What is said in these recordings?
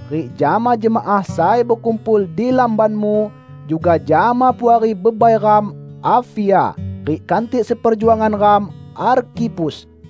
rik jama jemaah sai bekumpul di lambanmu; juga jama puari bebai ram, Apfia rik kantik seperjuangan ram, Arkhipus.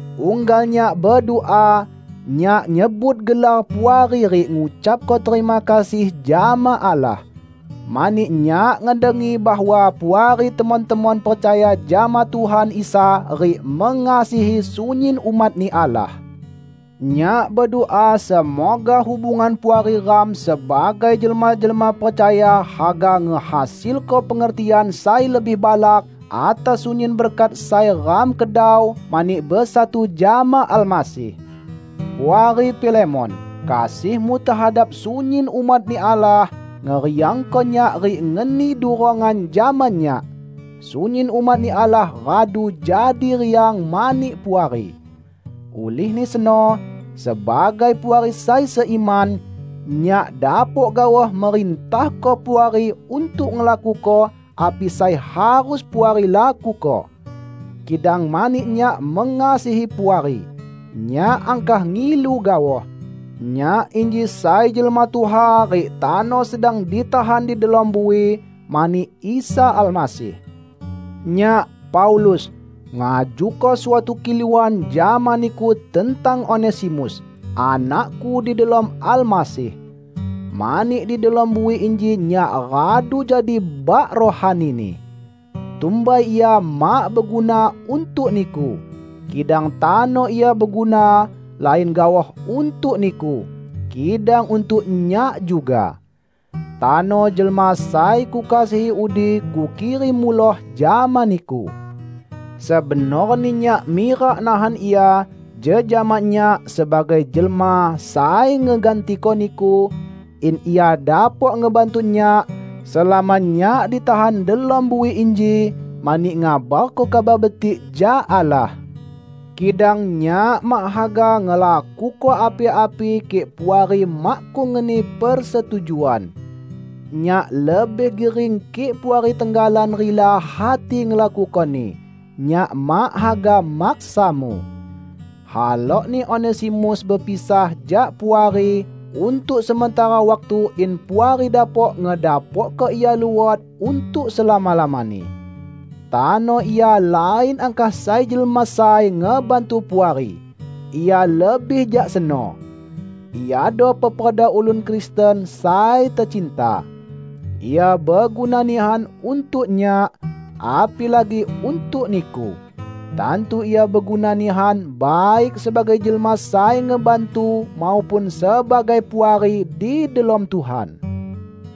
Unggal nyak bedua, nyak nyebut gelar Puari rik ngucapko terima kasih jama Allah. Mani nyak ngedengi bahwa Puari temon-temon percaya jama Tuhan Isa rik mengasihi sunyin umat-Ni Allah. Nyak bedua semoga hubungan puari ram sebagai jelma-jelma percaya haga ngehasilko pengertian sai lebih balak atas sunyin berkat sai ram kedau mani besatu jama Almasih. Puari Filemon, kasihmu tehadap sunyin umat-Ni Allah, ngeriangko nyak rik ngeni durongan jama nyak! Sunyin umat-Ni Allah radu jadi riang mani Puari. Ulihni seno, sebagai puari sai seiman, nyak dapok gaoh merintahko Puari untuk ngelakuko api sai harus Puari lakuko. Kidang mani nyak mengasihi Puari, nyak angkah ngilu gaoh. Nyak inji sai jelma tuha rik tano sedang ditahan di delom bui mani Isa Almasih. Nyak, Paulus, ngajuko suatu kiluan jama niku tentang Onesimus, anakku di delom Almasih. Mani di delom bui inji nyak radu jadi bak rohanini. Tumbai ia mak beguna untuk niku, kidang tano ia beguna, lain gaoh untuk niku, kidang untuk nyak juga. Tano jelma sai kukasihi udi kukirim muloh jama niku. Sebenorni nyak mirak nahan ia jejama nyak sebagai jelma sai ngegantiko niku, in ia dapok ngebantu nyak, selama nyak ditahan delom bui inji mani ngabarko Kabar Betik jak Allah. Kidang nyak mak haga ngelakuko api-api kik Puari makkung ngeni persetujuan. Nyak lebih gering kik Puari tenggalan rila hati ngelakukoni; nyak mak haga maksamu. Halokni Onesimus bepisah jak Puari untuk sementara waktu in Puari dapok ngedapokko ia luot untuk selama-lamani. Tano ia lain angkah sai jelma sai ngebantu Puari; ia lebih jak seno. Iado peperda ulun Kristen sai tecinta. Ia beguna nihan untuk nyak, apilagi untuk niku! Tantu ia beguna nihan baik sebagai jelma sai ngebantu maupun sebagai puari di delom Tuhan!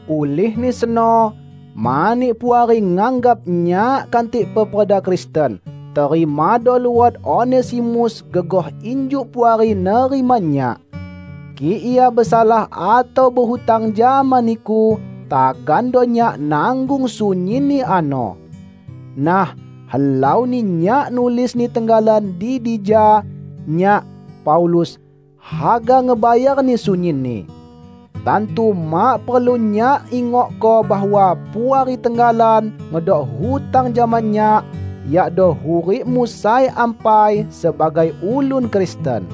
Ulihni seno, mani Puari nganggap nyak kantik peperda Kristen, terimado luot Onesimus gegoh injuk Puari nerima nyak. Kik ia besalah atau behutang jama niku, tagando nyak nanggung sunyinni ano. Nah, helauni nyak nulisni tenggalan di dija: Nyak, Paulus, haga ngebayarni sunyinni. (Tantu mak perlu nyak ingokko bahwa Puari tenggalan ngedok hutang jama nyak, yakdo hurikmu sai ampai sebagai ulun Kristen.)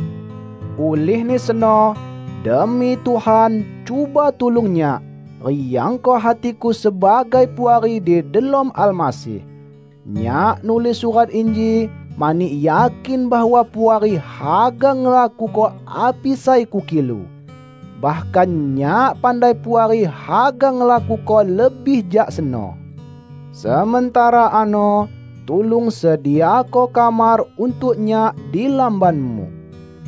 Ulihni seno, demi Tuhan cuba tulung nyak, riangko hatiku sebagai puari di delom Almasih. Nyak nulis surat inji mani yakin bahwa Puari haga ngelakuko api sai kukilu. Bahkan nyak pandai Puari haga ngelakuko lebih jak seno. Sementara ano, tulung sediako kamar untuk nyak di lambanmu,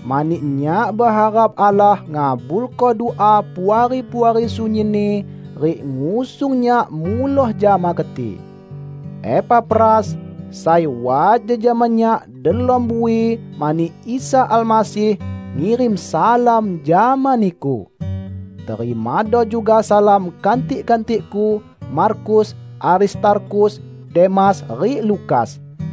mani nyak beharap Allah ngabulko dua Puari-puari sunyinni rik ngusung nyak muloh jama keti. Epafras, sai wat jejama nyak delom bui mani Isa Almasih, ngirim salam jama niku. Terimado juga salam kantik-kantikku: Markus, Aristarkhus, Demas rik Lukas.